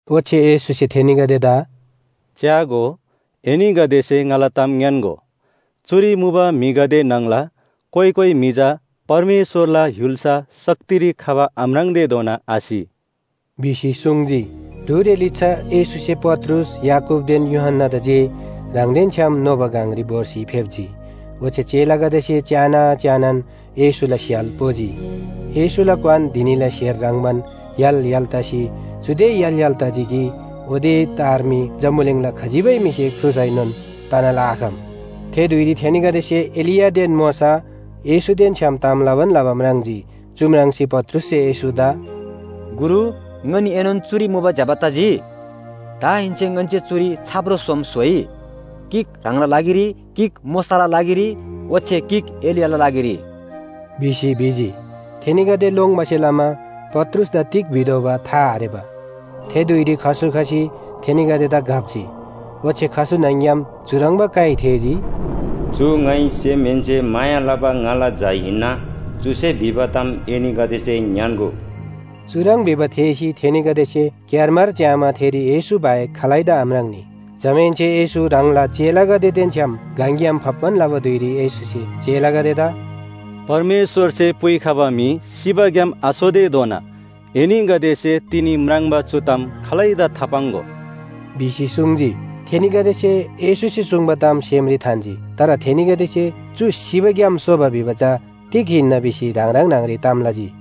ओच्‍छे येशूसे थेनीगदेदा “च्‍यागो, एनीगदेसे ङाला ताम ङ्‌यान्‍गो, चुरी मुबा म्‍हिगदे न्‍हङला कोइ कोइ म्‍हि चा परमेश्‍वरला य्‍हुल्‍सा शक्तिरी खबा आम्राङ्तेधोना आसि” भिसी सुङ्जी। ढुरे लिच्‍छा येशूसे पत्रुस, याकूबदेन यूहन्‍नादा जे ह्राङदेन छ्‌याम नोबा गङरी भोर्सी फेप्‍जी। ओच्‍छे चेलागदेसे च्‍याना च्‍यानान येशूला स्‍य्‍हाल पोजी। येशूला क्‍वान धिनीला स्‍हेर ह्रङ्‌बान य्‍हाल य्‍हाल तसी चुदे य्‍हाल य्‍हाल तजी कि ओते तार मी जम्‍बुलिङला खजिबै म्‍हिसे ख्रुसैनोन तना लआखम। थे धुइरी थेनीगदेसे एलियादेन मोशा, येशूदेन छ्‌याम ताम लबान लबा म्राङ्जी। चु म्राङ्सी पत्रुससे येशूदा “गुरु, ङनीएनोन चुरी मुबा ज्‍यबा तजी। दाहेन्‍से ङन्‍से चुरी छाप्रो सोम स्‍होइ, गिक ह्राङला लागिरी, गिक मोशाला लागिरी ओच्‍छे गिक एलियाला लागिरी” भिसी भिजी। थेनीगदे लोङ्बासे लमा पत्रुसदा तिग भितोःबा था आरेबा। थे धुइरी खसु खसी थेनीगदेदा घप्‍जी। ओच्‍छे खसु न्‍हङ‍ग्‍याम चुह्रङ्बा काइ थेःजी, “चु ङाइ सेमहेन्‍से माया लबा ङाला झा हिन्‍ना, चुसे भिबा ताम एनीगदेसे ङ्‌यान्‍गो।” चुह्रङ् भिबा थेःसी थेनीगदेसे क्‍यारमार च्‍यामा थेरी येशू बाहेक खालैदा आम्राङ्‌नी। जमाहेन्‍से येशू ह्राङला चेलागदेदेन छ्‌याम गङग्‍याम फाप्‍बान लबा धुइरी येशूसे चेलागदेदा “परमेश्‍वरसे पुइखबा म्‍हि सिबाग्‍याम आसोतेधोना एनीगदेसे तिनी म्राङ्बा चु ताम खालैदा थापाङ्‍गो” भिसी सुङ्जी। थेनीगदेसे येशूसे सुङ्बा ताम सेमरी थान्‍जी। तर थेनीगदेसे चु सिबा ग्‍याम सोबा भिबा चा तिग हिन्‍ना भिसी ह्राङ ह्राङ न्‍हङरी ताम लजी।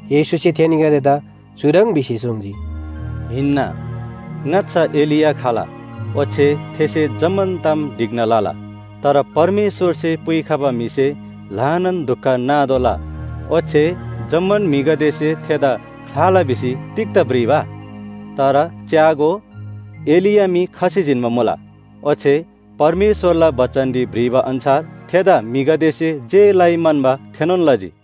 येशूसे थेनीगदेदा चुह्रङ् भिसी सुङ्जी, “हिन्‍ना, ङाच्‍छा एलिया खला ओच्‍छे थेसे जम्‍मान ताम ढिक्‍ना लला। तर परमेश्‍वरसे पुइखबा म्‍हिसे ल्‍हानान दुख नातोःला ओच्‍छे जम्‍मान म्‍हिगदेसे थेदा ख्‍लाला भिसी तिग्‍दा भ्रिबा? तर च्‍यागो, एलिया मी खसी जिन्‍बा मुला। ओच्‍छे परमेश्‍वरला बचनरी भ्रिबा अन्‍छार थेदा म्‍हिगदेसे जे लइ म्‍हन्‍बा थेनोन लजी।”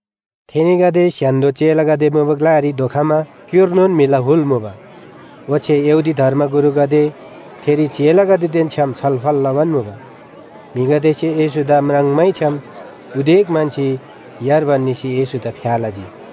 थेनीगदे स्‍य्‍हान्‍दो चेलागदे मुबा ग्‍लारी धोखमा क्‍युर्नोन म्‍हिला हुल मुबा। ओच्‍छे यहूदी धर्मगुरुगदे थेरी चेलागदेदेन छ्‌याम छलफल लबान मुबा। म्‍हिगदेसे येशूदा म्राङ्मैछ्‍याम उदेक म्‍हन्‍सी यार्बान निसी येशूदा फ्‍या लजी।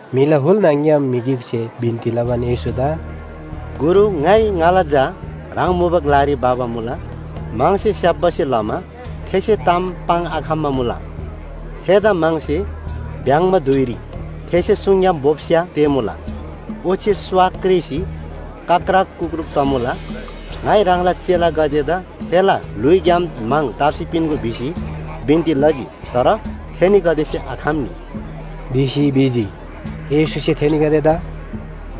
म्‍हिला हुल न्‍हङ‍ग्‍याम म्‍हि गिकसे बिन्‍ती लबान येशूदा “गुरु, ङाइ ङाला झा ह्राङ मुबा ग्‍लारी भबा मुला। म्‍हङसे स्‍याप्‍बासे लमा थेसे ताम पाङ्‌आखम्‍बा मुला। थेदा म्‍हङसे भ्‍याङ्‍बा धुइरी थेसे सुङग्‍याम बोप्‍स्‍या तेःमुला। ओच्‍छे स्‍वा क्रेसी कक्‍रक कुक्‍रूक तमुला। ङाइ ह्राङला चेलागदेदा थेला ल्‍हुइग्‍याम म्‍हङ ताप्‍सी पिन्‍गो भिसी बिन्‍ती लजी, तर थेनीगदेसे आखम्‍नी” भिसी भिजी। येशूसे थेनीगदेदा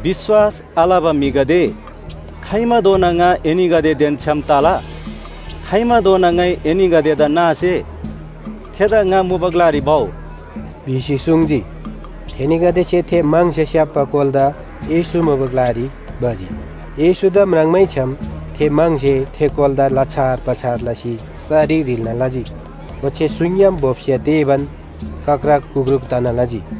“विश्‍वास आलबा म्‍हिगदे, खाइमाधोना ङा एनीगदेदेन छ्‌याम तला? खाइमाधोना ङाइ एनीगदेदा नासे? थेदा ङा मुबा ग्‍लारी भउ” भिसी सुङ्जी। थेनीगदेसे थे म्‍हङसे स्‍याप्‍बा कोलादा येशू मुबा ग्‍लारी भजी। येशूदा म्राङ्मैछ्‍याम थे म्‍हङसे थे कोलादा लछार पछार लसी सरी ह्रिल्‍ना लजी। ओच्‍छे सुङग्‍याम बोप्‍स्‍या तेःबान कक्‍रक कुक्‍रूक तना लजी।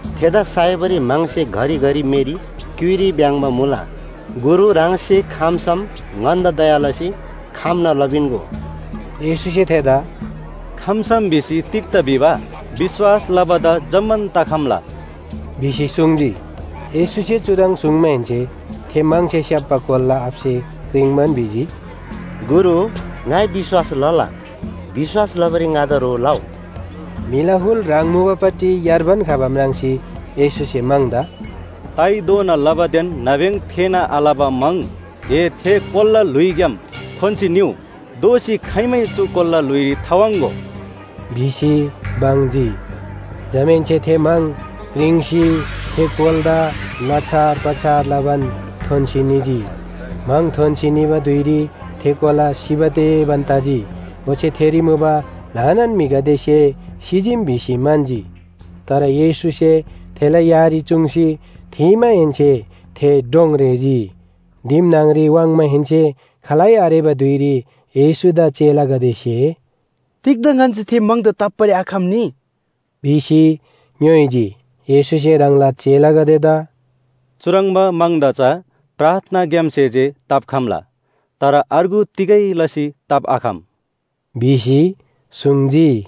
थेदा साइबारी म्‍हङसे घरिघरि मेरी, क्‍युइरी भ्‍याङ्‍बा मुला। गुरु, ह्राङसे खम्‍सम ङन्‍दा दया लसी खम्‍ना लपिन्‍गो।” येशूसे थेदा “खम्‍सम भिसी तिग्‍दा भिबा? विश्‍वास लबादा जम्‍मान तखम्‍ला” भिसी सुङ्जी। येशूसे चुह्रङ् सुङ्माहेन्‍से थे म्‍हङसे स्‍याप्‍बा कोलाला आबासे क्रिङ्बान भिजी, “गुरु, ङाइ विश्‍वास लला। विश्‍वास लबारी ङादा ह्रो लउ।” म्‍हिला हुल ह्राङ मुबापट्टि यार्बान खबा म्राङ्सी येशूसे म्‍हङदा “ताइधोना लबादेन नाब्‍यङ थेःना आलबा म्‍हङ ए थे कोलाला ल्‍हुइग्‍याम थोन्‍सी निउ! दोःसी खाइमै चु कोलाला ल्‍हुइरी थावाङ्‍गो” भिसी बङ्जी। जमाहेन्‍से थे म्‍हङ क्रिङ्सी थे कोलादा लछार पछार लबान थोन्‍सी निजी। म्‍हङ थोन्‍सी निबा धुइरी थे कोला सिबा तेबान तजी। ओच्‍छे थेरी मुबा ल्‍हानान म्‍हिगदेसे सिजीम भिसी म्‍हन्‍जी। तर येशूसे थेला यारी चुङ्सी थीमाहेन्‍से थे डोङ रेःजी। दिम न्‍हङरी वाङ्माहेन्‍से खालै आरेबा धुइरी येशूदा चेलागदेसे “तिग्‍दा ङन्‍से थे म्‍हङदा ताप्‍बारी आखम्‍नी” भिसी ङ्‌योइजी। येशूसे ह्राङला चेलागदेदा “चुह्रङ्बा म्‍हङदा चा प्रार्थनाग्‍यामसे जे ताप्‍खम्‍ला, तर अर्गु तिगै लसी ताप्‍आखम” भिसी सुङ्जी।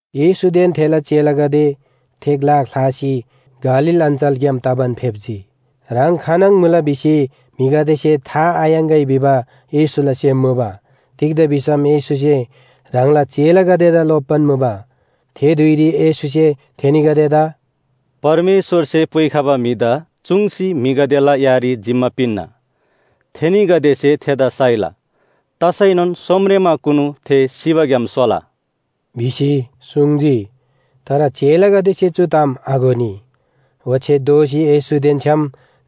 येशूदेन थेला चेलागदे थे ग्‍ला ख्‍लासी गालील अञ्‍चलग्‍याम तबान फेप्‍जी। ह्राङ खानङ मुला भिसी म्‍हिगदेसे था थायाङ्‍गै भिबा येशूला सेम मुबा। तिग्‍दा भिसम येशूसे ह्राङला चेलागदेदा लोप्‍बान मुबा। थे धुइरी येशूसे थेनीगदेदा “परमेश्‍वरसे पुइखबा म्‍हिदा चुङ्सी म्‍हिगदेला यारी जिम्‍मा पिन्‍ना। थेनीगदेसे थेदा साइला, तसैनोन सोमरेमाकुनु थे सिबाग्‍याम सोला” भिसी सुङ्जी तर चेलागदेसे चु ताम आघोनी, ओच्‍छे दोःसी येशूदेन छ्‌याम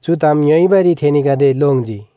चु ताम ङ्‌योइबारी थेनीगदे लोङ्जी।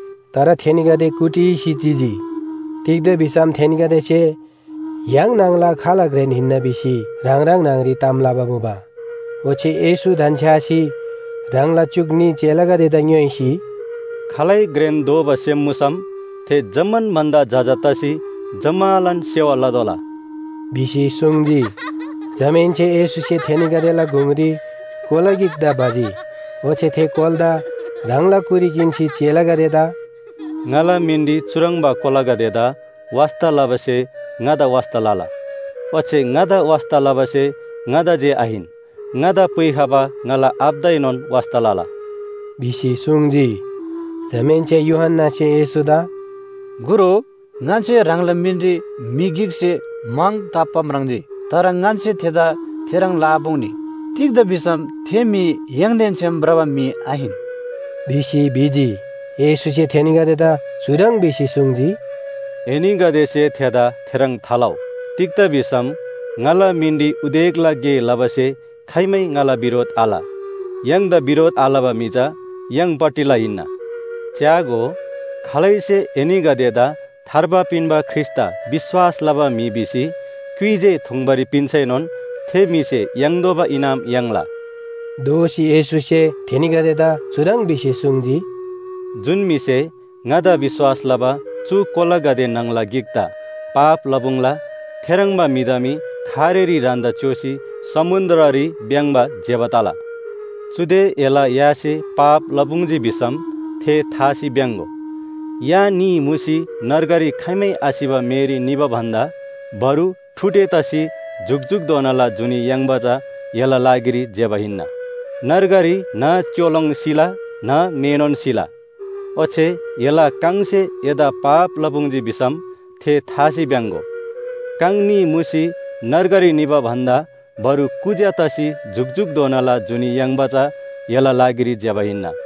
तर थेनीगदे कुटिसी चिजी। तिग्‍दा भिसम थेनीगदेसे “य्‍हाङ न्‍हङला खाल घ्रेन हिन्‍ना” भिसी ह्राङ ह्राङ न्‍हङरी ताम लबा मुबा। ओच्‍छे येशू धन्‍छ्‌यासी ह्राङला च्‍युक न्‍ही चेलागदेदा ङ्‌योइसी, “खालै घ्रेन दोबा सेम मुसम थे जम्‍मान भन्‍दा जजा तसी जम्‍मालान सेवा लतोःला” भिसी सुङ्जी। जमाहेन्‍से येशूसे थेनीगदेला गुङरी कोला गिकदा भजी। ओच्‍छे थे कोलादा ह्राङला कुरी किन्‍सी चेलागदेदा, “ङाला मिनरी चुह्रङ्बा कोलागदेदा वास्‍ता लबासे ङादा वास्‍ता लला, ओच्‍छे ङादा वास्‍ता लबासे ङादा जे आहिन, ङादा पुइखबा ङाला आबादाएनोन वास्‍ता लला” भिसी सुङ्जी। जमाहेन्‍से यूहन्‍नासे येशूदा “गुरु, ङन्‍से ह्राङला मिनरी म्‍हि गिकसे म्‍हङ ताप्‍बा म्राङ्जी। तर ङन्‍से थेदा थेह्रङ् लआपुङ्नी तिग्‍दा भिसम थे म्‍हि य्‍हाङदेन छ्‌याम भ्रबा म्‍हि आहिन” भिसी भिजी। येशूसे थेनीगदेदा चुह्रङ् भिसी सुङ्जी, “एनीगदेसे थेदा थेह्रङ् थालउ। तिग्‍दा भिसम ङाला मिनरी उदेकला गे लबासे खाइमै ङाला बिरोध आल। य्‍हाङदा बिरोध आलबा म्‍हि चा य्‍हाङपट्टिला हिन्‍ना। च्‍यागो, खालैसे एनीगदेदा थार्बा पिन्‍बा ख्रीष्‍टदा विश्‍वास लबा म्‍हि भिसी क्‍युइ जे थुङ्बारी पिन्‍सैनोन थे म्‍हिसे याङ्तोःबा इनाम याङ्ला।” दोःसी येशूसे थेनीगदेदा चुह्रङ् भिसी सुङ्जी, “जुन म्‍हिसे ङादा विश्‍वास लबा चु कोलागदे न्‍हङला गिकदा पाप लपुङ्ला, थेह्रङ्बा म्‍हिदा मी खारेरी ह्रान्‍दा च्‍योसी समुन्‍द्ररी भ्‍याङ्‍बा ज्‍यबा तला। चुदे एला यासे पाप लपुङ्जी भिसम थे थासी भ्‍याङ्‍गो। या न्‍ही मुसी नर्गरी खाइमै आसिबा मेरी निबा भन्‍दा बरु ठुडे तसी जुकजुकधोनाला जुनी याङ्बा चा एला लागिरी ज्‍यबा हिन्‍ना। नर्गरी न्‍ह च्‍योलोङ सिला न्‍ह मेनोन सिला। ओच्‍छे एला काङसे एदा पाप लपुङ्जी भिसम थे थासी भ्‍याङ्‍गो। काङ न्‍ही मुसी नर्गरी निबा भन्‍दा बरु कुज्‍या तसी जुकजुकधोनाला जुनी याङ्बा चा एला लागिरी ज्‍यबा हिन्‍ना।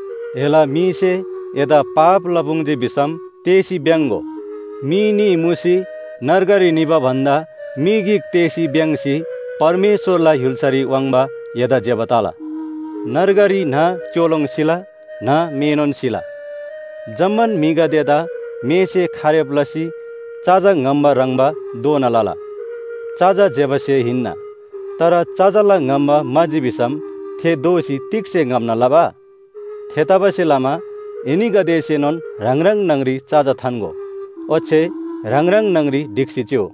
एला मीसे एदा पाप लपुङ्जी भिसम तेःसी भ्‍याङ्‍गो मी न्‍ही मुसी नर्गरी निबा भन्‍दा मी गिक तेःसी भ्‍याङ्‍सी परमेश्‍वरला य्‍हुल्‍सारी वाङ्बा एदा ज्‍यबा तला। नर्गरी न्‍ह च्‍योलोङ सिला, न्‍ह मेनोन सिला। जम्‍मान म्‍हिगदेदा मेसे खारेब लसी चजा ङम्‍बा ह्रङ्‌बा दोना लला। चजा ज्‍यबा स्‍हे हिन्‍ना, तर चजाला ङम्‍बा म्‍हाजी भिसम थे दोःसी तिग्‍से ङम्‍ना लबा? थेतबासेलमा एनीगदेसेनोन ह्राङ ह्राङ न्‍हङरी चजा थान्‍गो ओच्‍छे ह्राङ ह्राङ न्‍हङरी ढिक्‍सी चिउ।”